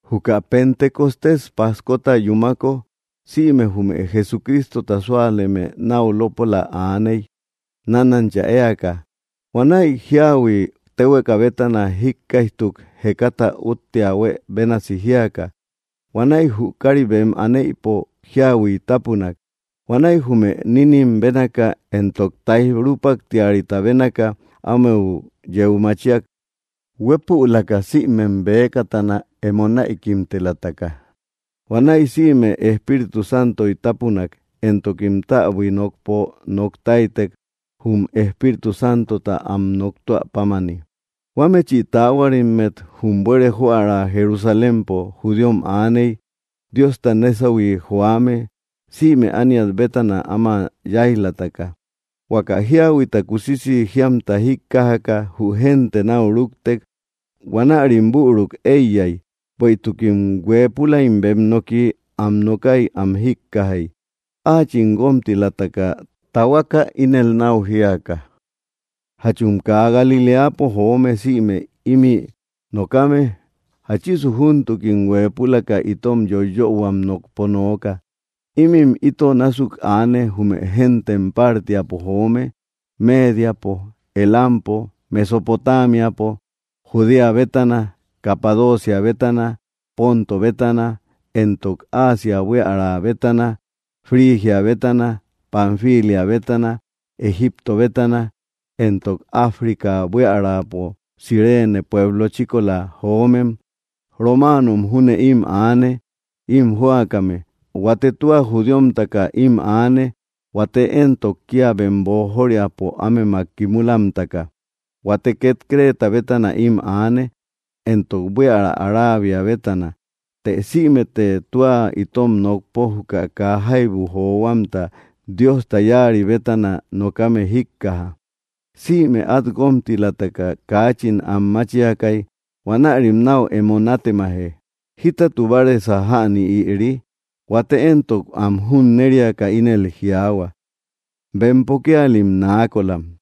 Juka Pentecostés pajkota yumáko, sïme jume Jesuristota súaleme náu lópola aaney; nánancha éaka. Huanäi jíahui tehueka bétana jíkkaijtuk, jekata úttea huë bénasi jíaka. Huanäi jü káari bem anéïpo jíahuiy tápunak. Huanäi jume nínnim bénaka éntok taij rupáktiriata bénaka ámeu yeu machíak, huepülaka sïmem bëkatana emo näikimtelataka. Huanäi sïme Espíritu Santoy tapunak, éntokim täbui nokpo noktáitek jum Espíritu Santota am noktúä pámani. Huámechi taáhuarimmet jum buere joära Jerusalémpo judíom aaney, Diosta nésahui joame, sïme ániat bétana áma yáij‑lataka. Huaka jíahuita kusisi jíamta jíkkajaka jü génte nau rúktek. Huanärim büruk eiyai, bueïtukim huëpulaim bem noki am nokái am jíkkajai áachim guómtilataka tahuaka ínel nau jiaka: —Jachum kaa Galiléapo joome sïme imï nokame, ¿jáchisu júntukim huepülaka itom yoiyöhuam nokpo nooka? Ímim ito násuk aane jume géntem Pártiapo joome, Médiapo, Elampo, Mesopotámiapo, Judea bétana, Capadocia bétana, Ponto bétana, éntok Asia buiära bétana, Frigia bétana, Panfilia bétana, Egipto bétana, éntok África buíaräpo Cirene pueblo chíkola joómem. Romáanom júne im aane im jóakame. Huate tua judíomtaka im aane, huate éntok, kia bem boojóriäpo ámemak kimúlamtaka. Huate ket Creta bétana im aane, éntok buiära Arabia bétana. Të sïmete tua itom nokpo juka kaa jaibu johuamta Diosta yáari bétana nokame jíkkaja. Sïme at guómtilataka kaachin anmáchiakai. Huanärim nau emo nátemaje: —¿Jítatu báaresa jäni ïri? Huate éntok, am junnériaka ínel jiaahua: —Bempo kíalim naakolam.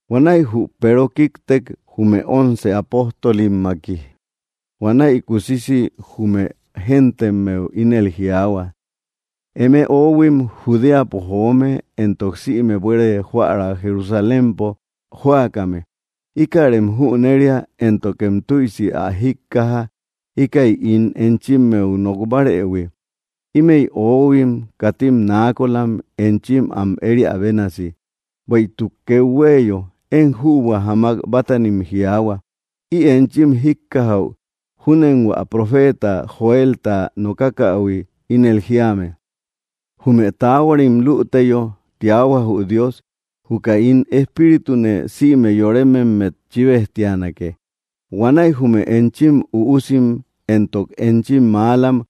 Huanäi jü Peero kíktek, jume once apóstolimmaki. Huanäi kusisi jume géntemmeu ínel jiaahua: —Eme oóhuim Judéapo joome éntok sïme buere joära Jerusalémpo jóakame, íkärem jüneria, éntokem tüisi ä jíkkaja íka ín enchimmeu nokbárëhui. Ímëi oóhuim katim naakolam enchim am ériä bénasi, bueïtuk kethuéeyo, én jübua jamak bátanim jiaahua. Ï enchim jíkkajäu júnen hua profeta Joelta nokákähui ínel jíame: Jume taahuarim lüteyo, tiahua jü Dios, juka ín Espíritune sïme yorémemmet chibejtianake. Huanäi jume enchim üusim éntok enchim mälam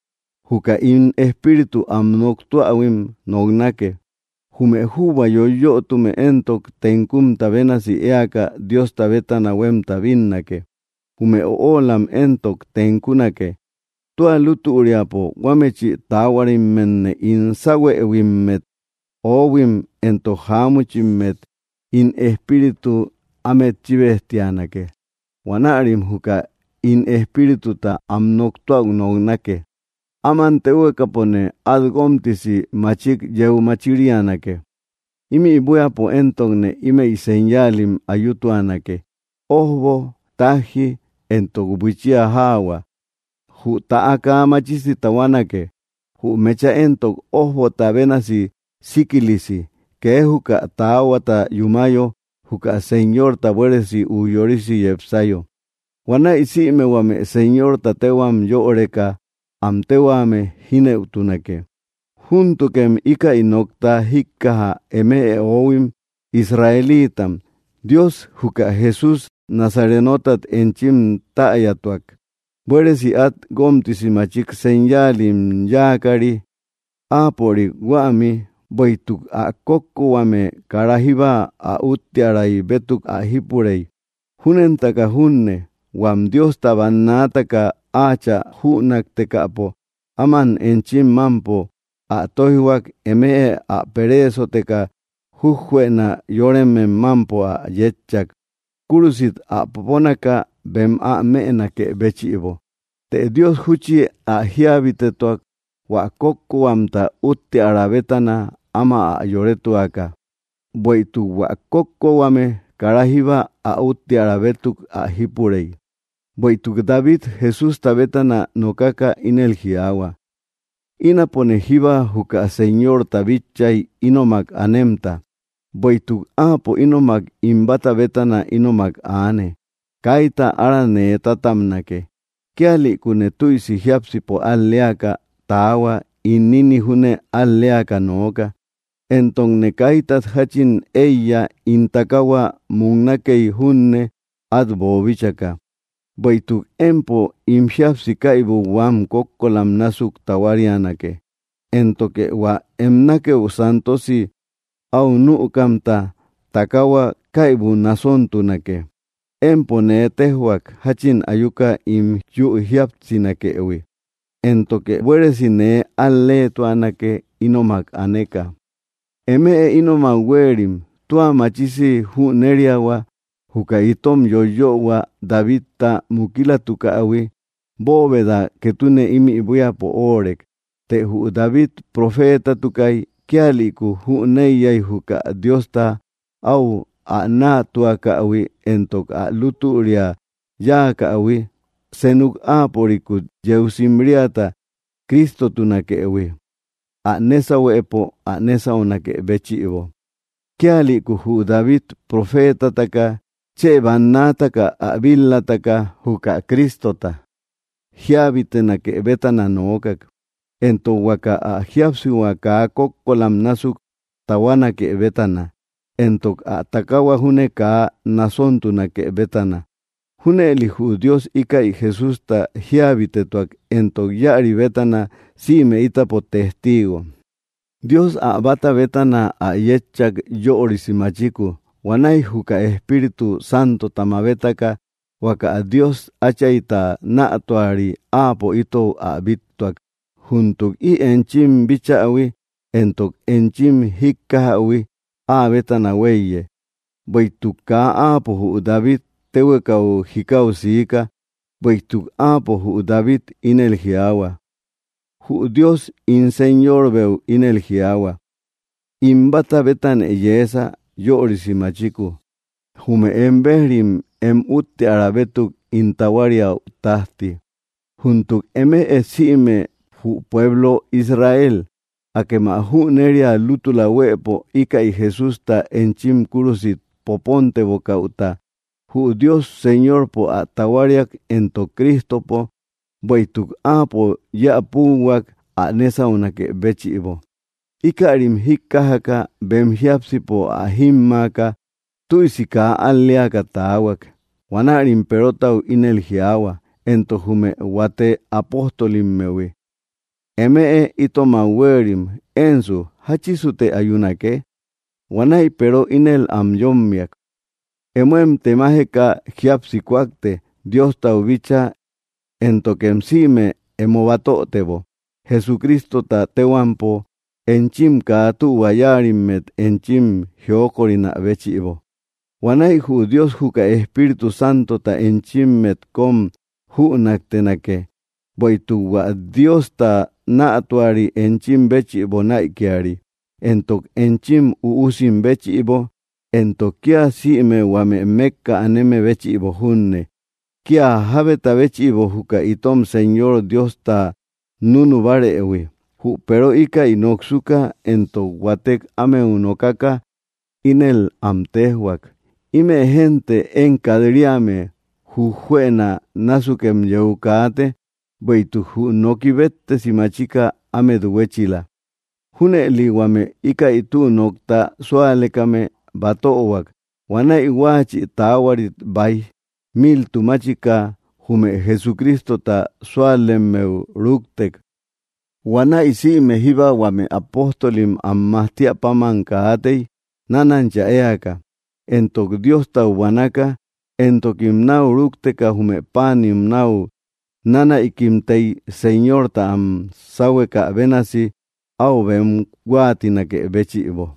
juka ín Espíritu am noktúähuim noknake, jume jübua yoyötume éntok, tenkumta bénasi éaka Diosta bétana huemta bínnake. Jume öolamm entok tenkunake. Tua lútüriapo huámechi taáhuarimmetne ín sáuhuëhuimmet ohuim entok jamuchimmet ín Espíritu amet chibejtianake, huanärim juka ín Espírituta am noktúäu noknake. Áman téhuekapone at guómtisi machik yeu machírianake, imï buíapo éntokne ímëi señaalim ayutuanake: ójbo, tajji éntok buichía jaahua. Jü täa kaa machisi tahuanake, jü mecha éntok, ójbota bénasi síkilisi, kee juka täahuata yúmayo juka Señorta, buéresi ujyorisi yepsayo. Huanäi sïme huame Señorta téhuam yöreka am tehuame jínëutunake. ’Júntukem ikäy nokta jíkkaja eme oóhuim Israelíitam, Dios juka Jesús Nazarenotat enchim tayatuak, buéresi at guómtisi machik señayáalim yakari áapörik huämi. Bueïtuk ä kókkohuame kara jíbba ä úttiäray bétuk ä jípurey. Júnentaka junne huam Diosta bannaataka áachä jünaktekäpo áman enchim mampo ä tóijhuak, eme ä pereesoteka jujjuëna yóremem mampo ä yétchak, kúrusit ä poponaka bem ä mënakë béchïbo. Të Dios júchi ä jíabitetuak, hua kókkohuamta útteara bétana áma ä yorétuaka, bueïtuk hua kókkohuame kara jíba ä útteara bétuk ä jípurei. Bueïtuk David Jesústa bétana nokaka ínel jiaahua: Ínapone jíba juka Señorta bitchay ínomak anemta. Bueïtuk áapo ínomak ín báta bétana ínomak aane, kayta ára nee tatabnake. Kíalïkune tüisi jiápsipo al‑leaka tahuak ín ninï junne ál‑leaka nooka. Éntokne kaítat jachin eiya ín takahua muknakey junne át boobíchaka, bueïtuk empo ín jíapsi kaibu huam kókkolam násuk tahuárianake, éntoke hua em nákëu santosi au nükamta takahua kaybu nasóntunake. Empo nee téjhuak jachin ayuka ín yu jíapsinakëhui, éntoke buéresi nee al-leetuanake ínomak aneka. ’Eme ínomak huéerim, tua machisi jüneriahua juka itom yoyöhua Davidta mukilatukähui bóoveda ketune ímï buíapo óorek. Të jü David profeetatukay; kíalïku jüneiyai juka Diosta au ä nätuakähui éntok ä lútüria yáakähui senuk áapörikut yeu simriata Cristotunakëhui, ä nésauhuëpo ä nésaunakë béchïbo. Kíalïku jü David profetataka chë bannaataka ä bil-lataka juka Crístota jíabitenake bétana nookak, entok huaka ä jíapsihua kaa kókkolam násuk tahuánake bétana, entok ä takahua júne kaa nasontunake bétana. Júnëli jü Dios íkäi Jesústa jíabitetuak, éntok íäri bétana sïme ítapo testiigom. Dios ä báta bétana ä yétchak yörisi machiku. Huanäi juka Espíritu Santota mabétaka, huaka Dios Áchaita nätuari, áapo itou ä bíttuak. Júntuk ï enchim bíchähui éntok enchim jíkkajähui áa bétana huéiye. Bueïtuk kaa áapo jü David téhuekau jikáu siika; bueïtuk áapo, jü David, ínel jiaahua: Jü Dios ín Señorbeu ínel jiaahua: “In báta bétanë yeesa yörisi machiku, jume em béj‑rim em útteara bétuk ín tahuáriäu tajti.” ’Júntuk eme sïme jü pueblo Israel, akem ä jüneria lútula huëpo íkäi Jesústa enchim kúrusit popóntebokäuta jü Dios Señorpo ä tahuáriak éntok Crístopo, bueïtuk áapo yéä púuhuak ä nésaunakë béchïbo. Íkärim jíkkajaka, bem jiápsipo ä jímmaaka, tüisi kaa al‑léaka taahuak. Huanärim Perotau ínel jiaahua éntok jume huate apóstolimmehui: —Eme itomak huéerim, ¿ensu, jáchisute ayúnake? Huanäi Peero ínel am yómmiak: —Emóem temajeka jíapsi kúakte Diostau bíchaa, éntokem sïme emo batötebo Jesucrístota téhuampo, enchim kaa tühua yáarimmet enchim jiókorinä béchïbo. Huanäi jü Dios juka Espíritu Santota enchimmet kom jünaktenake. Bueïtuk hua Diosta nätuari enchim béchïbo näikiari, éntok enchim üusim béchïbo, éntok kia sïme huame mekka aneme béchïbo junne; kia jábeta béchïbo juka itom Señor Diosta nunubárëhui. Jü Peero íkäi noksuka, éntok huátek ámeu nokaka, ínel am téjhuak: —Ime génte én kat‑riame jujuëna násukem yeu kaate, bueïtuk jü noki béttesi machika ámet hüechila. Júnëli huame íkäi tü nokta súalekame batöhuak. Huanäi huáachï taáhuarit baij miltumáchika jume Jesucrístota súalemmeu rúktek. Huanäi sïme jíba huame apóstolim am majtíä páman kaatei, nánancha éaka éntok Diostau buanaka. Éntokim nau rúkteka jume páanim nat nánäikimtei Señorta am sáhuekä bénasi au bem huáatinakë béchïbo.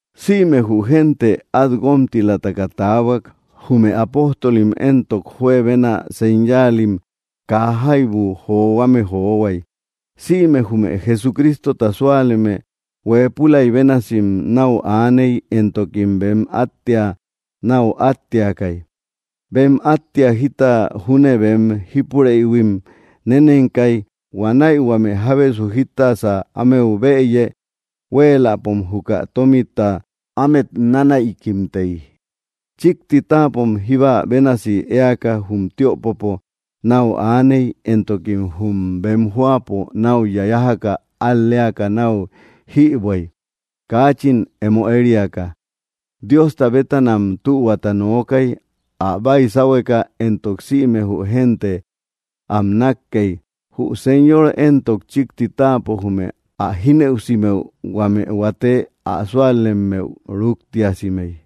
Sïme jü génte at guómtilataka taahuak. Jume apóstolim éntok, juebena señáalim kaa jaibu johuame johuai. Sïme jume Jesucrístota súaleme huépülai bénasi nau aaney, éntokim bem áttea nau átteakai. Bem áttea, jita júne bem jípurëhuim nénenkai, huanäi huame jábesu jítasä ámeu bëyë huéeläpom juka tómita ámet nánäikimtei. Chikti táapom jíba bénasi éaka jum tiöpopo nau aaney, éntokim jum bem jóapo nau yájaka al‑léaka nau jïbuäi, kaachin emo ériaka. Diosta bétanam tühuata nookai ä baisáuhueka, éntok sïme jü génte am nakkei. Jü Señor entok, chikti táapo jume ä jínëusimëu huame huate ä súalemmeu rúktiasimey.